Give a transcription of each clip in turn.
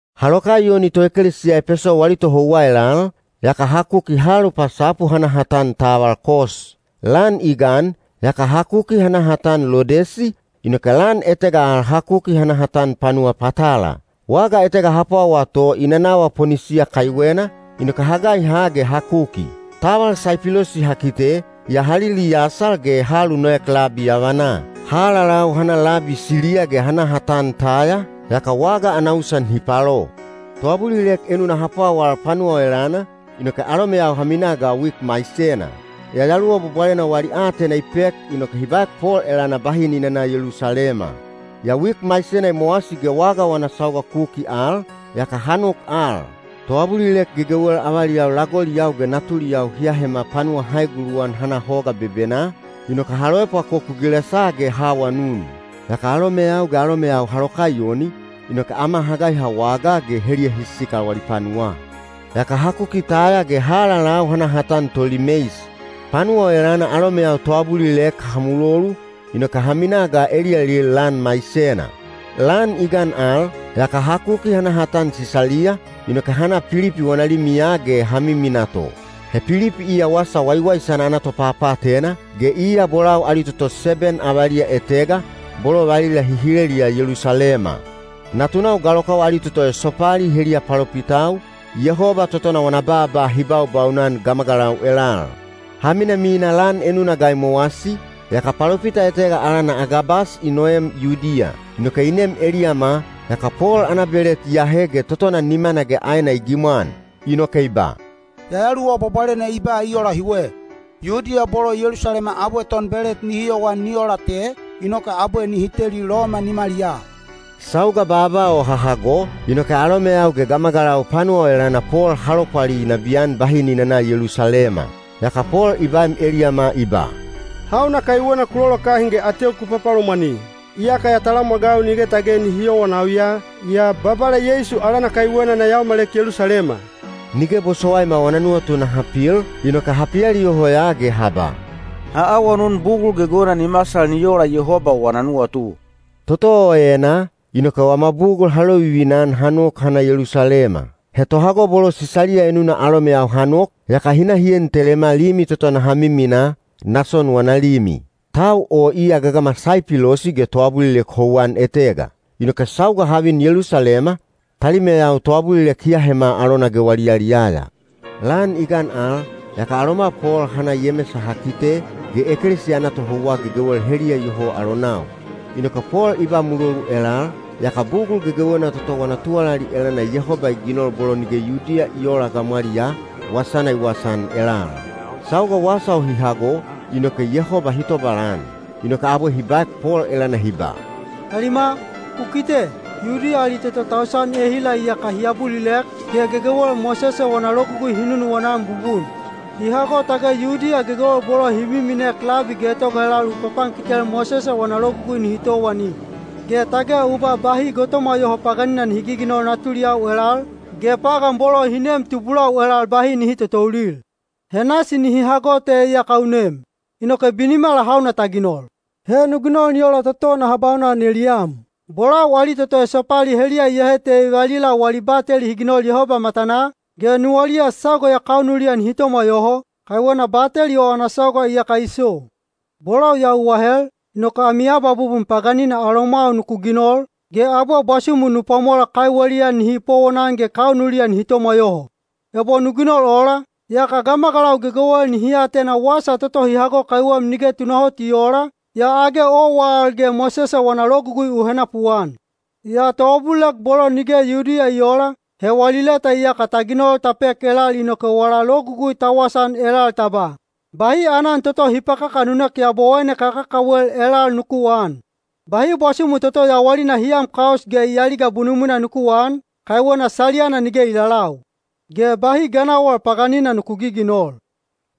Ha lokaiyoni toekelesiya Epeso wali tohouwa elal, yaka ha kuki ha alupasapu ha na ha tan taval Kos. Lan i gan, yaka ha kuki ha na ha tan Lodesi, inoke lan etega al ha kuki ha na ha tan panuwa Patala. Waga etega ha pwawaa to i nanawa Ponisiya kaiwena, inoke ha gaiha ge ha kuki. Taval Saipilosi ha kite, yaa ha liliyasal ge ha alunoek labi yavanaa. Ha alalau ha na labi Siliya ge ha na ha tan Taya, yaka waga ana usan hi palo. Toabulilek enuna ha pwawal panuwa o elana, inoke alomeyau ha mina ga wik maisena. Yayaluwa Bwabwalena wali aatena i pek inoke hi baek Pol elana bahi ni nana Yelusalema. Yaa wik maisena i mowasi ge waga wana sauga kuki al, yaka ha nok al. Toabulilek gegewel avaliyau lagoliyau ge natuliyau hi ahema panuwa ha eguluwan ha na hoga bebenaa, inoke ha loepwakoku gilesaa ge ha awanun. Yaka alomeyau ge alomeyau ha lokaiyoni, inoke ama ha gaiha wagaa ge heliya hi sikal wali panuwaa. Yaka ha kuki Taya ge ha alalau ha na ha tan Tolimeis. Panuwa o elana alomeyau toabulilek ha mulolu, inoke ha minaa ga eliyalil lan maisena. Lan i gan al, yaka ha kuki ha na ha tan Sisaliya, inoke ha na Pilipi wana limiya ge ha miminaa to. He Pilipi iya Wasa Waiwaisana ana topapaatena, ge iya bolau ali toto seben avaliya etega, bolo valila hi hileliya Yelusalema. Natunau galokau ali toto esopali heliya palopitau, Yehoba totona wana baaba hi baubaunan gamagalau elal. Ha minamina lan enuna ga i mowasi, yaka palopita etega alana Agabas i noem Yudiya. Inoke i nem eliyama, yaka Pol ana belet i ahe ge totona nimana ge aena i gimwan. Inoke i ba, “Yayaluwa Bwabwalena i ba i ola hiwe: ‘Yudiya bolo Yelusalema abwe tonbelet nihi yowan ni ola te, inoke abwe nihi teli Loma nimaliyaa.’” Sauga baaba o ha hago, inoke alomeyau ge gamagalau panuwa o elana Pol ha lopwali nabiyan bahi ni nana Yelusalema. Yaka Pol i baem eliyama i ba, “Hauna kaiwena ku lolokahin ge ateu ku papalomwani? Iyaka ya talamwagau nige tage nihi yowanau ya, yaa Babala Yeisu alana kaiwena na yaomalek Yelusalema.” Nige bosowaima wana nuwatu naha pil, inoke ha pialiyoho ya ge ha ba, “Ha awanun bugul gegewena ni masal ni ola Yehoba wana nuwatu.” Toto o enaa, inoke wama bugul ha lovivina-an ha nok ha na Yelusalema. He tohago bolo Sisaliya enuna alomeyau ha nok, yaka hi na hi en telema limi toto naha miminaa, Nason wana limi. Tau o iya gagama Saipilosi ge toabulilek houwan etega. Inoke sauga ha vin Yelusalema, talimeyau toabulilek hi ahema alona ge wali yaliyaya. Lan i gan al, yaka aloma Pol ha na Yemesa ha kite, ge ekelesiya ana tohouwa gegewel heliya iyoho alonau. Inoke Pol i ba mulolu elal, yaka bugul gegewena toto wana tuwalali elana Yehoba i ginol bolo nige Yudiya i oola gamwaliyaa, wasana i wasaan elal. Sauga wasa o hi hago, inoke Yehoba hi tobalan. Inoke abwe hi baek Pol elana hi ba, “Talima, u kite, Yudiya ali toto tausan ehila iyaka hi abulilek, ge gegewel Mosese wana Logugui hi nunuwana-an bubun. Hi hago tage Yudiya gegewel bolo hi miminek labi getoga elal u papankitel Mosese wana Logugui nihi towani. Ge tage u ba bahi gotomwa yoho paganina nihi giginol natuliyau elal, ge pagan bolo hi neem tubulau elal bahi nihi totoulil. He nasi nihi hago te iyaka u nem. Inoke binimala hauna ta ginol? He nu ginol ni ola toto naha baunan eliyam. Bolau ali toto esopali heliya iyahe te valila wali bateli hi ginol Yehoba matanaa, ge nuwaliya sauga ya kaunuliya nihi tomwa yoho, kaiwena bateli o ana sauga iyaka i so. Bolau ya u ahel, inoke ami abwabubun paganina alomwau nuku ginol, ge abwe bwasumu nu pwamola kaiweliya nihi powonan ge kaunuliya nihi tomwa yoho. Ebo nu ginol ola, yaka gamagalau gegewel nihi atena wasa toto hi hago kaiwem nige tunahot i oola, yaa age owa al ge Mosese wana Logugui u henapuan. Yaa toabulilek bolo nige Yudiya i oola, he wali leta iyaka ta ginol ta pek elal inoke wala logugui ta wasaan elal ta ba, ‘Bahi aanan toto hi pakakanunek yabowaine kakakawel elal nuku aan. Bahi bwasumu toto yawalina hi am kaus ge i aliga bunumwina nuku aan, kaiwena saliyana nige i lalau. Ge bahi ganawal paganina nuku giginol.’”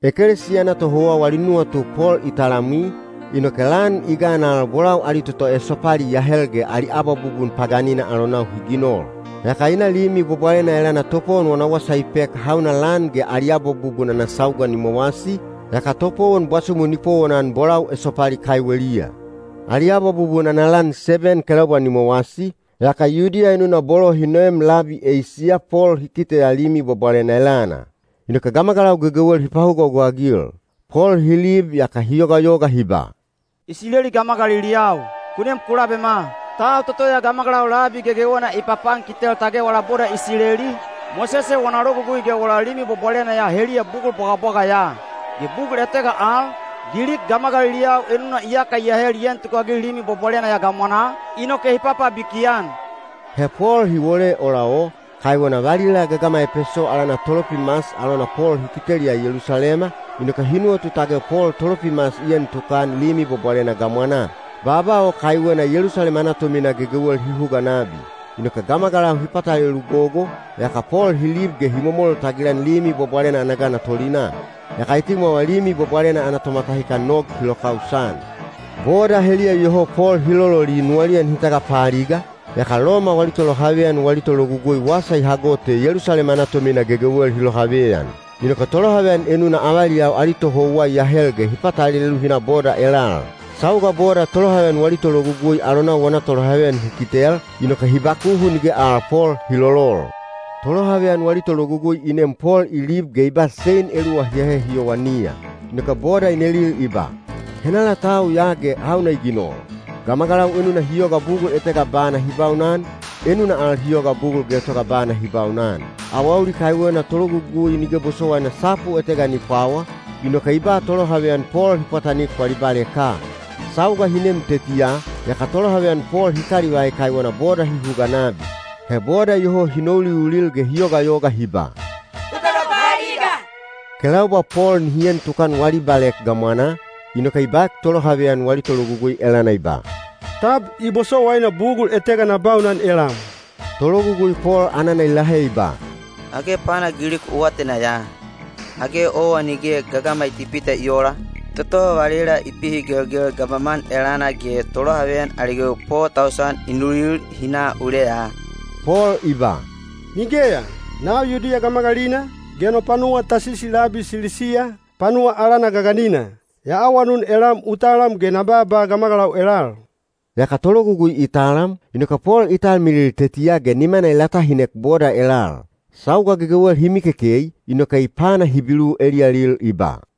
Ekelesiya ana tohouwa wali nuwatu Pol i talamwi, inoke lan i gan al bolau ali toto esopali i ahel ge ali abwabubun paganina alonau hi ginol. Yaka i na Limi Bwabwalena elana topowon wana wasa i pek hauna lan ge ali abwabubun ana sauga ni mowasi, yaka topowon bwasumu ni powonan bolau esopali kaiweliya. Ali abwabubun ana lan seben kelaubwa ni mowasi, yaka Yudiya enuna bolo hi noem labi Eisiya Pol hi kiteya Limi Bwabwalena elana. Inoke gamagalau gegewel hi pahugahuga-agil. Pol hi lib yaka hi yogayoga hi ba, “Isileli gamagaliliyau, ku nem ku labema. Tau toto ya gamagalau labi gegewena i papankitel tage wala boda Isileli, Mosese wana Logugui ge wala Limi Bwabwalena ya heliya bugul bwagabwaga ya. Ge bugul etega al, Gilik gamagaliliyau enuna iyaka i ahel i en tukagil Limi Bwabwalena ya gamwanaa, inoke hi papabiki-an.” He Pol hi wole ola o, kaiwena valila gagama Epeso alana Tolopimas alona Pol hi kiteliya Yelusalema, inoke hi nuwatu tage Pol Tolopimas i en tukan Limi Bwabwalena gamwanaa. Baaba o kaiwena Yelusalema ana tomina gegewel hi huga nabi. Inoke gamagalau hi patalelu gogo, yaka Pol hi lib ge hi momol tagilan Limi Bwabwalena ana gana tolinaa. Yaka etimwawa Limi Bwabwalena ana tomatahikan nog hi lokausan. Boda heliya iyoho Pol hi lololi nuwaliya nihi tagapaaliga, yaka Loma wali tolohaveyan wali tologugui wasa i hago te Yelusalema ana tomina gegewel hi lohaveyan. Inoke tolohaveyan enuna avaliyau ali tohouwa i ahel ge hi patalelu hi na boda elal. Sauga boda tolohaveyan wali tologugui alonau wana tolohaveyan hi kitel, inoke hi bakuhu nige al Pol hi lolol. Tolohaveyan wali tologugui i nem Pol i lib ge i ba sein eluwa hi ahe hi yowaniya. Inoke boda i nelil i ba, “Henala tau ya ge hauna i ginol?” Gamagalau enuna hi yoga bugul etega bana hi baunan, enuna al hi yoga bugul getoga bana hi baunan. Awauli kaiwena tologugui nige bosowaina sapu etega ni pwawa, inoke i ba tolohaveyan Pol hi pwatanik wali baleka. Sauga hi nem tetiya, yaka tolohaveyan Pol hi kalivai kaiwena boda hi huga nabi. He boda iyoho hi nouliulil ge hi yogayoga hi ba, “Ku tagapaaliga!” Kelaubwa Pol nihi en tukan wali balek gamwanaa, inoke i baek tolohaveyan wali tologugui elana i ba, “Tab i bosowaina bugul etega na baunan elam?” Tologugui Pol anana i lahe i ba, “Age pana Gilik u atena ya? Age owa nige gagama Itipita i oola, toto valila i pihigelgel gamaman elana ge tolohaveyan ali gewi po tausan i nulil hi na uleya?” Pol i ba, “Nigeya! Nau Yudiya gamagalina, ge no panuwa Tasisi labi Silisiya, panuwa alana gaganina. Ya awanun elam u talam ge na baaba gamagalau elal.” Yaka tologugui i talam, inoke Pol i talmilil tetiya ge nimana i latahinek boda elal. Sauga gegewel hi mikekei, inoke i pana Hibilu eliyalil i ba: